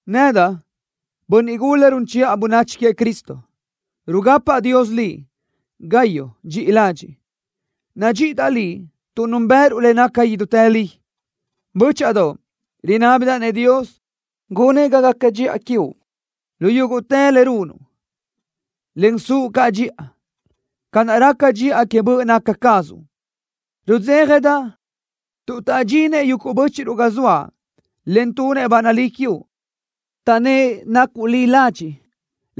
Nedaʼ, bönniʼ gula run chiʼa bönachi queëʼ Cristo, rugapaʼ Dios liʼ, Gayo dxiʼi ladxiʼ. Nadxíʼidaʼ liʼ tuʼ núnbëʼëruʼ le naca idútë li. Bö́chaʼadoʼ, rinábidaʼ-nëʼ Dios gunëʼ ga gaca dxiʼa quiuʼ lu yúguʼtë le runuʼ, en suʼ caʼ dxiʼa, ca naʼ raca dxiʼa que böʼ naca cazuʼ. Rudzéjadaʼ tuʼ taʼdxinëʼ yuguʼ bö́chiʼruʼ ga zoaʼ, en tunëʼ ba nalí quiuʼ, taʼnnë́ʼ nacuʼ li ladxiʼ,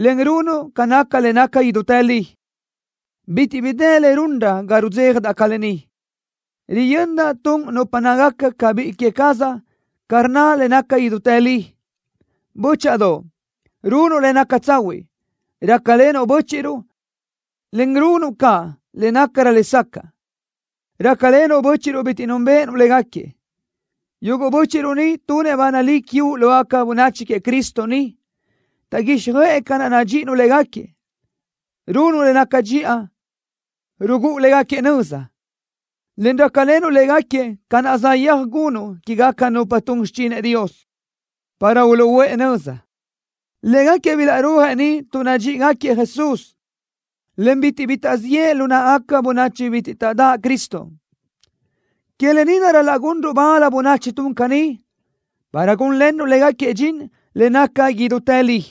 en runuʼ ca naca le naca idútë li. Bitiʼ bi dë le runrö ga rudzéjadaʼ ca lë ni, riyöndaʼ tun nupa nácagaca ca biʼi que cazaʼ ca rnna le naca idútë li. Bö́chaʼadoʼ, runuʼ le naca tsahuiʼ, rácalenuʼ bö́chiʼruʼ, en runuʼ caʼ le nácarö lesacaʼ, rácalenuʼ bö́chiʼruʼ bitiʼ núnbeʼenuʼ légaquiëʼ. Yuguʼ bö́chiʼruʼ ni tunëʼ ba nalí quiuʼ lógaca bönachi queëʼ Cristo ni, taʼguíxjöʼë ca naʼ nadxíʼinuʼ légaquiëʼ. Runuʼ le naca dxiʼa, rugúʼu légaquiëʼ nöza, en rácalenuʼ légaquiëʼ ca naʼ saʼyéaj gunuʼ quégaca nupa tun xichinëʼ Dios, para uluʼúʼë nöza. Légaquiëʼ bilaʼrúajëʼ ni tuʼ nadxíʼigaquiëʼ Jesús, en bitiʼ bi taʼziʼë lu náʼagaca bönachi bitiʼ taʼdáʼ Cristo. Que lë ni naʼ ral-laʼ gunruʼ bal bönachi tun caní, para gúnlenruʼ légaquiëʼ dxin que le naca idútë li.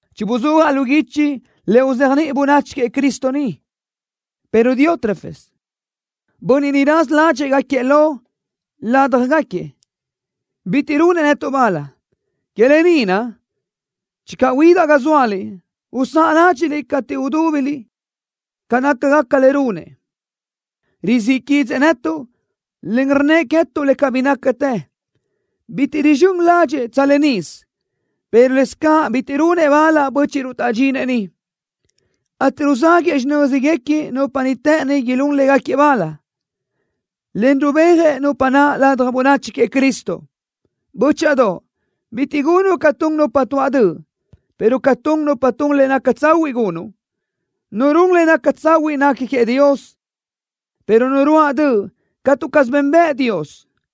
Chibuzúajaʼ lu guichi le uzéajniʼi bönachi queëʼ Cristo niʼ, pero Diótrefes, bönniʼ niʼ raza ládxëʼë gáquiëʼ lo ládjagaquiëʼ, bitiʼ runëʼ netuʼ bal. Que lë ni naʼ, channö huidaʼ ga zóaliʼ, usáʼa ládxiʼliʼ cateʼ udúbiliʼ ca nácagaca le runëʼ. Rizíʼ quídzëʼë netuʼ, en rnnëʼ queë́tuʼ le cabí nácatë. Bitiʼ rizxö́n ládxëʼë tsa lë nisö, pero lëscaʼ bitiʼ runëʼ bal bö́chiʼruʼ taʼdxinëʼ niʼ, ateʼ ruzáguëʼë xinö́zguequi nupa niʼ të́ʼëni ilún légaquiëʼ bal, en rubéajëʼ nupa naʼ ladaj bönachi queëʼ Cristo. Bö́chaʼadoʼ, bitiʼ gunuʼ ca tun nupa tuaʼ döʼ, pero ca tun nupa tun le naca tsahuiʼ gunuʼ. Nu run le naca tsahuiʼ nequi queëʼ Dios, pero nu ruáʼ döʼ catu caz benbëʼ Dios.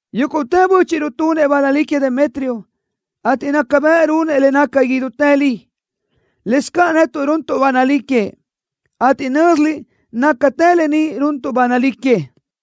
Yúguʼtë bö́chiʼruʼ tunëʼ ba nalí queëʼ Demetrio, ateʼ naca bëʼ runëʼ le naca idútë li. Lëscaʼ netuʼ runtuʼ ba nalí queëʼ, ateʼ nö́ziliʼ nácatë lë ni runtuʼ ba nalí queëʼ.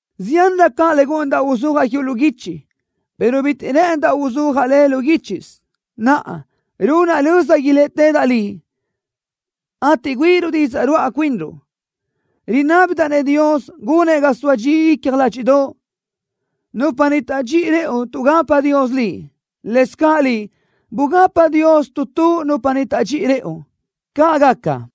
Ziánrö caʼ le gúʼunidaʼ uzúajaʼ quiuʼ lu guichi, pero bitiʼ rë́ʼëndaʼ uzúajaʼ le lu guíchisö. Naʼa, runaʼ löza iléʼetedaʼ liʼ, ateʼ güíʼiruʼ didzaʼ ruáʼa cuinruʼ. Rinábidaʼ-nëʼ Dios gunëʼ ga soa dxi icja ládxiʼdoʼo. Nupa ni taʼdxíʼi rëʼu tuʼgapa Dios liʼ. Lëscaʼ liʼ, bugapa Dios tu tu nupa niʼ taʼdxíʼi rëʼu. ¡Caʼ gaca!